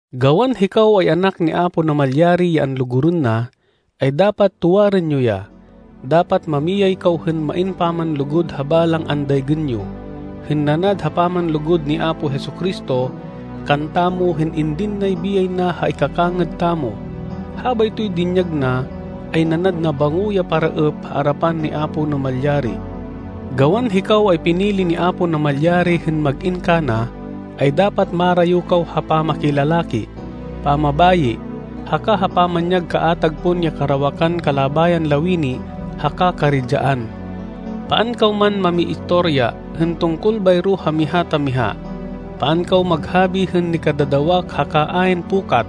Gawan hikaw ay anak ni Apo Namalyari ya anlugurên na, ay dapat tuwarên yo ya. Dapat mamiyay kaw hên main pamanlugud ha balang andaygên yo, hên nanad ha pamanlugud ni Apo Jesu-Cristo kantamo hên indin nay biyay na ha ikakangêd tamo. Habaytoy dinyag na ay nanad nabango ya paraêp ha arapan ni Apo Namalyari. Gawan hikaw ay pinili ni Apo Namalyari hên mag-in kana, ay dapat marayo kaw ha pamakilalaki, pamabayi, haka ha pamanyag kaatag pon ya karawakan kalabayan lawini haka karidyaan. Paan kaw man mamiistoriya hên tungkol bayro ha miha ta miha. Paan kaw maghabi hên nikadadawak haka ayn pukat,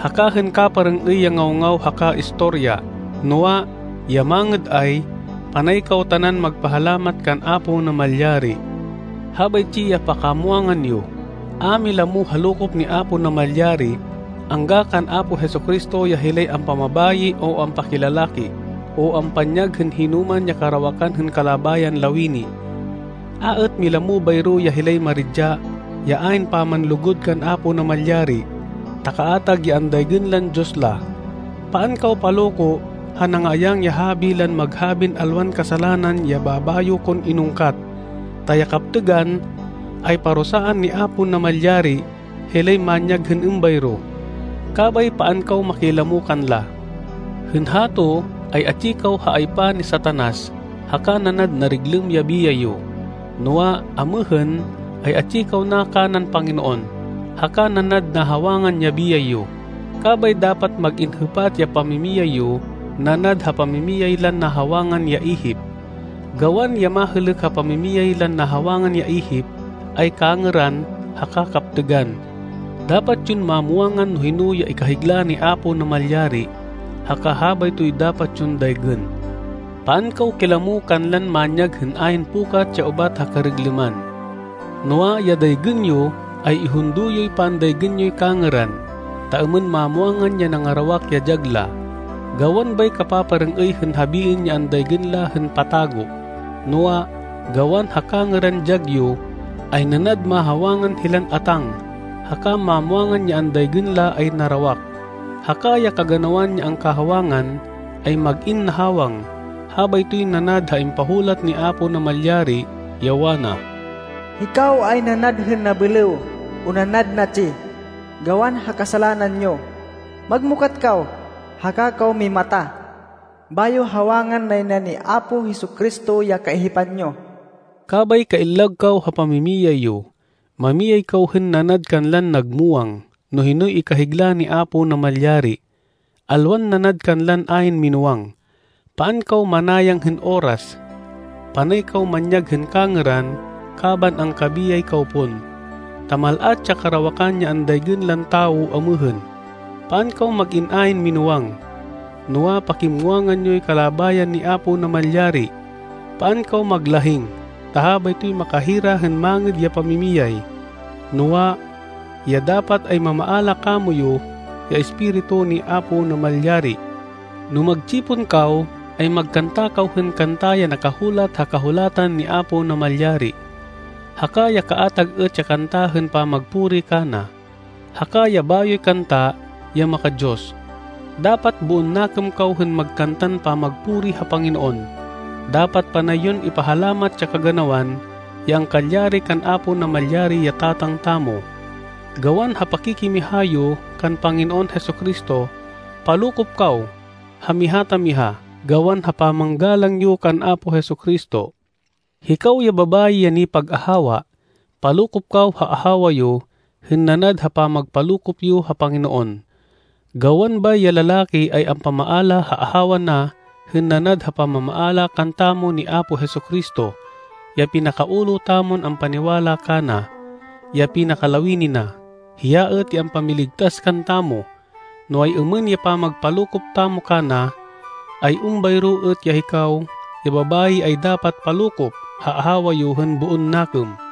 haka hên kaparêng-êy ya ngaw-ngaw haka istorya. Noa, ya mangêd ay, panay kaw tanan magpahalamat kan Apo Namalyari. Habaytsi ya pakamwangan yo: A milamo ha lokop ni Apo Namalyari angga kan Apo Jesu-Cristo ya hilay ampamabayi o ampakilalaki o ampanyag hên hinoman ya karawakan hên kalabayan lawini. A êt milamo bayro ya hilay maridya ya ayn pamanlugud kan Apo Namalyari ta kaatag ya andaygên lan diyos la. Paan kaw paloko ha nangaayang ya habi lan maghabin alwan kasalanan ya babayo kon inungkat. Ta ya kaptêgan ay parusaan ni Apo Namalyari hilay manyag hên êmbayro. Kabay paan kaw makilamo kanla. Hên hato ay atsi kaw ha aypa ni Satanas haka nanad nariglêm ya biyay yo, noa, amêhên ay atsi kaw na kanan Panginoon, haka nanad nahawangan ya biyay yo. Kabay dapat mag-in hêpat ya pamimiyay yo nanad ha pamimiyay lan nahawangan ya ihip. Gawan, ya mahêlêk ha pamimiyay lan nahawangan ya ihip, ay kangêran haka kaptêgan. Dapat yon mamwangan no hino ya ikahigla ni Apo Namalyari, haka habaytoy dapat yon daygên. Paan kaw kilamo kanlan manyag hên ayn pukat ya ubat ha kariglêman. Noa, ya daygên yo, ay ihundo yoy pandaygên yoy kangêran, ta êmên mamwangan ya nangarawak ya dyag la. Gawan bay kapaparêng-êy hên habiên ya andaygên la hên patago. Noa, gawan ha kangêran dyag yo, ay nanad mahawangan hilan atáng, haka mamwangan ya andaygên la ay narawak. Haka ya kaganawan ya angkahawangan, ay mag-in nahawang. Habaytoy nanad ha impahulat ni Apo Namalyari, ya wana, “Hikaw ay nanad hên nabêlêw o nanad natsi gawan ha kasalanan yo. Magmukat kaw, haka kaw mimata, bayo hawangan nay na ni Apo Jesu-Cristo ya kaihipan yo.” Kabay kaillag kaw ha pamimiyay yo. Mamiyay kaw hên nanad kanlan nagmuwang no hinoy ikahigla ni Apo Namalyari, alwan nanad kanlan ayn minúwang. Paan kaw manayang hên oras. Panay kaw manyag hên kangêran kaban angkabiyay kaw pon, ta mal-at ya karawakan ya andaygên lan tawo amêhên. Paan kaw mag-in ayn minúwang. Noa, pakimuwangan yoy kalabayan ni Apo Namalyari. Paan kaw maglahing ta habaytoy makahira hên mangêd ya pamimiyay. Noa, ya dapat ay mamaala kamoyu ya Espiritu ni Apo Namalyari. No magtsipon kaw ay magkanta kaw hên kanta ya nakahulat ha Kahulatan ni Apo Namalyari, haka ya kaatag êt ya kanta hên pamagpuri kana, haka ya bayoy kanta ya maka-Diyos. Dapat boon nakêm kaw hên magkantan pamagpuri ha Panginoon. Dapat panay yon ipahalamat ya kaganawan ya angkalyari kan Apo Namalyari ya Tatang tamo, gawan ha pakikimiha yo kan Panginoon Jesu-Cristo. Palokop kaw ha miha ta miha gawan ha pamanggalang yo kan Apo Jesu-Cristo. Hikaw ya babayi ya nipag-ahawa, palokop kaw ha ahawa yo hên nanad ha pamagpalokop yo ha Panginoon. Gawan bay ya lalaki ay ampamaala ha ahawa na hên nanad ha pamamaala kantamo ni Apo Jesu-Cristo, ya pinaka-ulo tamon ampaniwala kana, ya pinakalawini na. Hiya êt ya ampamiligtas kantamo. No ay-êmên ya pamagpalokop tamo kana, ay êmbayro êt ya hikaw ya babayi ay dapat palokop ha ahawa yo hên boon nakêm.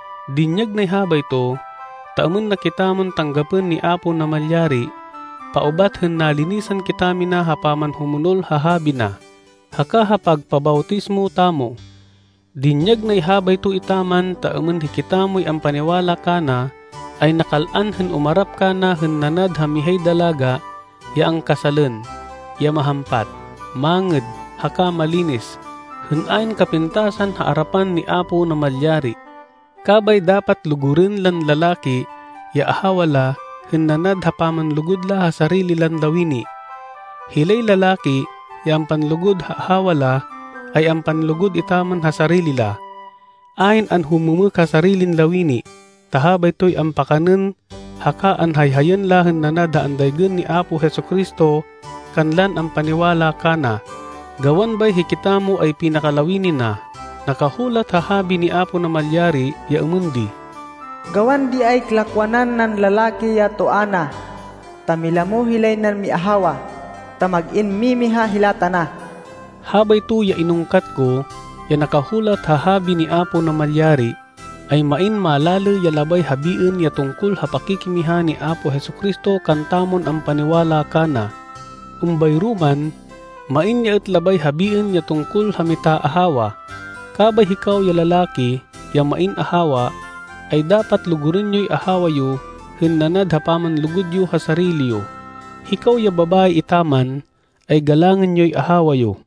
Dinyag nay habayto, ta êmên na kitamon tanggapên ni Apo Namalyari paubat hên nalinisan kitamina ha pamanhumonol ha Habi na, haka ha pagpabawtismo tamo. Dinyag nay habayto etaman ta êmên hikitamoy ampaniwala kana ay nakal-an hên umarap kana hên nanad ha mihay dalaga ya angkasalên ya mahampat, mangêd, haka malinis, hên ayn kapintasan ha arapan ni Apo Namalyari. Kabay dapat lugurên lan lalaki ya ahawa la hên nanad ha pamanlugud la ha sarili lan lawini. Hilay lalaki ya ampanlugud ha ahawa la ay ampanlugud etaman ha sarili la. Ayn anhumêmêk ha sarilin lawini, ta habaytoy ampakanên haka anhayhayên la hên nanad ha andaygên ni Apo Jesu-Cristo kanlan ampaniwala kana, gawan bay hikitamo ay pinakalawini na. Nakahulat ha Habi ni Apo Namalyari ya êmên di, “Gawan di ay lakwanan nan lalaki ya toa na ta milamo hilay nan miahawa, ta mag-in mimiha hila tana.” Habayto ya inungkat ko, ya nakahulat ha Habi ni Apo Namalyari, ay main malalê ya labay habiên ya tungkol ha pakikimiha ni Apo Jesu-Cristo kantamon ampaniwala kana. Êmbayro man, main ya êt labay habiên ya tungkol ha mitaahawa. Kabay hikaw ya lalaki ya main ahawa, ay dapat lugurên yoy ahawa yo hên nanad ha pamanlugud yo ha sarili yo. Hikaw ya babayi etaman, ay galangên yoy ahawa yo.